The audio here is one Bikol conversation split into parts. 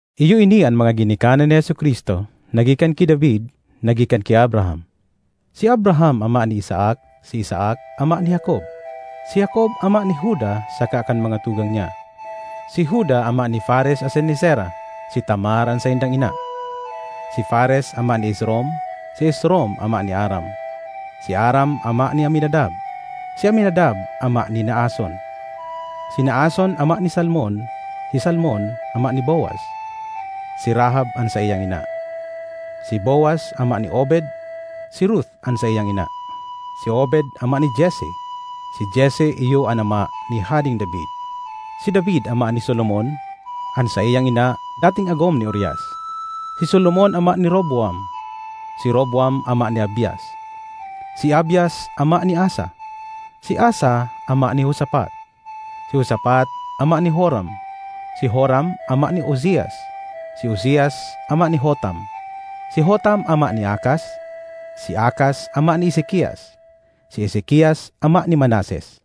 Iyo ini an mga ginikanan ni Jesu-Cristo, na gikan ki David, na gikan ki Abraham. Si Abraham ama ni Isaac, si Isaac ama ni Jacob, si Jacob ama ni Juda saka kan mga tugang niya; si Juda ama ni Fares asin ni Zera (si Tamar an saindang ina), si Fares ama ni Esrom, si Esrom ama ni Aram; si Aram ama ni Aminadab, si Aminadab ama ni Naason, si Naason ama ni Salmon; si Salmon ama ni Boaz (si Rahab an saiyang ina), si Boaz ama ni Obed (si Ruth an saiyang ina), si Obed ama ni Jesse; si Jesse iyo an ama ni Hadeng David. Si David ama ni Solomon (an saiyang ina dating agom ni Urias); si Solomon ama ni Roboam, si Roboam ama ni Abias, si Abias ama ni Asa; si Asa ama ni Josafat, si Josafat ama ni Joram, si Joram ama ni Uzias; si Uzias ama ni Jotam, si Jotam ama ni Acaz, si Acaz ama ni Ezekias; si Ezekias ama ni Manases,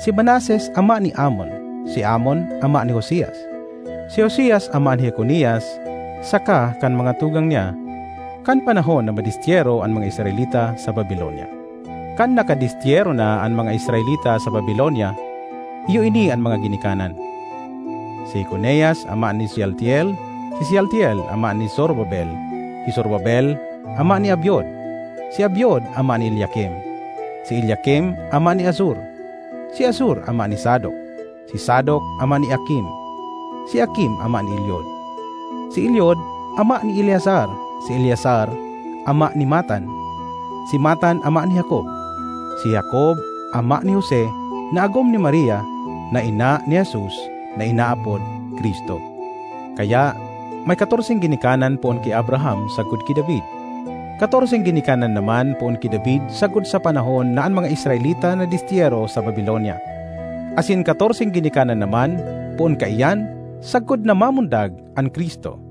si Manases ama ni Amon, si Amon ama ni Josias; si Josias ama ni Jeconias saka kan mga tugang niya, kan panahon na madestyero an mga Israelita sa Babilonia. Kan nakadestyero na an mga Israelita sa Babilonia, iyo ini an mga ginikanan: si Jeconias ama ni Sealtiel, si Sealtiel ama ni Zorobabel; si Zorobabel ama ni Abiud, si Abiud ama ni Eliakim, si Eliakim ama ni Azor; si Azor ama ni Zadok, si Zadok ama ni Akim, si Akim ama ni Eliud; si Eliud ama ni Eleazar, si Eleazar ama ni Matan, si Matan ama ni Jacob; si Jacob ama ni Jose, na agom ni Maria, na ina ni Jesus, na inaapod Cristo. Kaya, may katorseng ginikanan poon ki Abraham sagkod ki David; katorseng ginikanan naman poon ki David sagkod sa panahon na an mga Israelita nadestyero sa Babilonia, asin katorseng ginikanan naman poon kaiyan sagkod na mamundag an Cristo.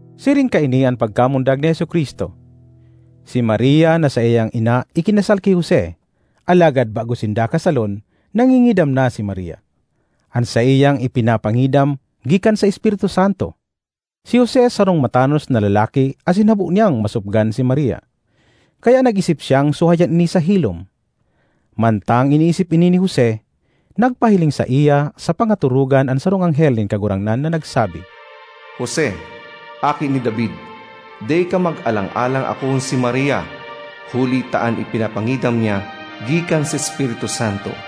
Siring kaini an pagkamundag ni Jesu-Cristo. Si Maria na saiyang ina ikinasal ki Jose, alagad bago sinda kasalon, nangingidam na si Maria. An saiyang ipinapangidam gikan sa Espiritu Santo. Si Jose sarong matanos na lalaki asin habo niyang masopgan si Maria; kaya nag-isip siyang suhayan ini sa hilom. Mantang iniisip ini ni Jose, nagpahiling saiya sa pangatorogan an sarong anghel nin Kagurangnan na nagsabi, “Jose, aki ni David, dai ka magalang-alang akoon si Maria, huli ta an ipinapangidam niya gikan sa Espiritu Santo.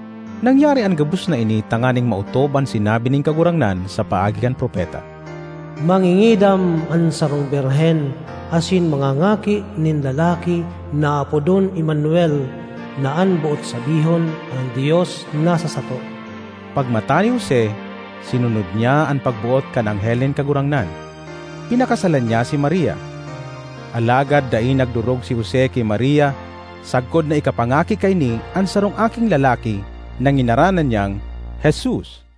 Nangyari an gabos na ini tanganing maotob an sinabi nin Kagurangnan sa paagi kan propeta, ”Mangingidam an sarong birhen asin mangangaki nin lalaki na aapodon Emmanuel” (na an boot sabihon, “an Dios nasa sato”). Pagmata ni Jose, sinunod niya an pagboot kan anghel nin Kagurangnan; pinakasalan niya si Maria. Alagad dai nagdorog si Jose ki Maria sagkod na ikapangaki kaini an sarong aking lalaki na nginaranan niyang Jesus.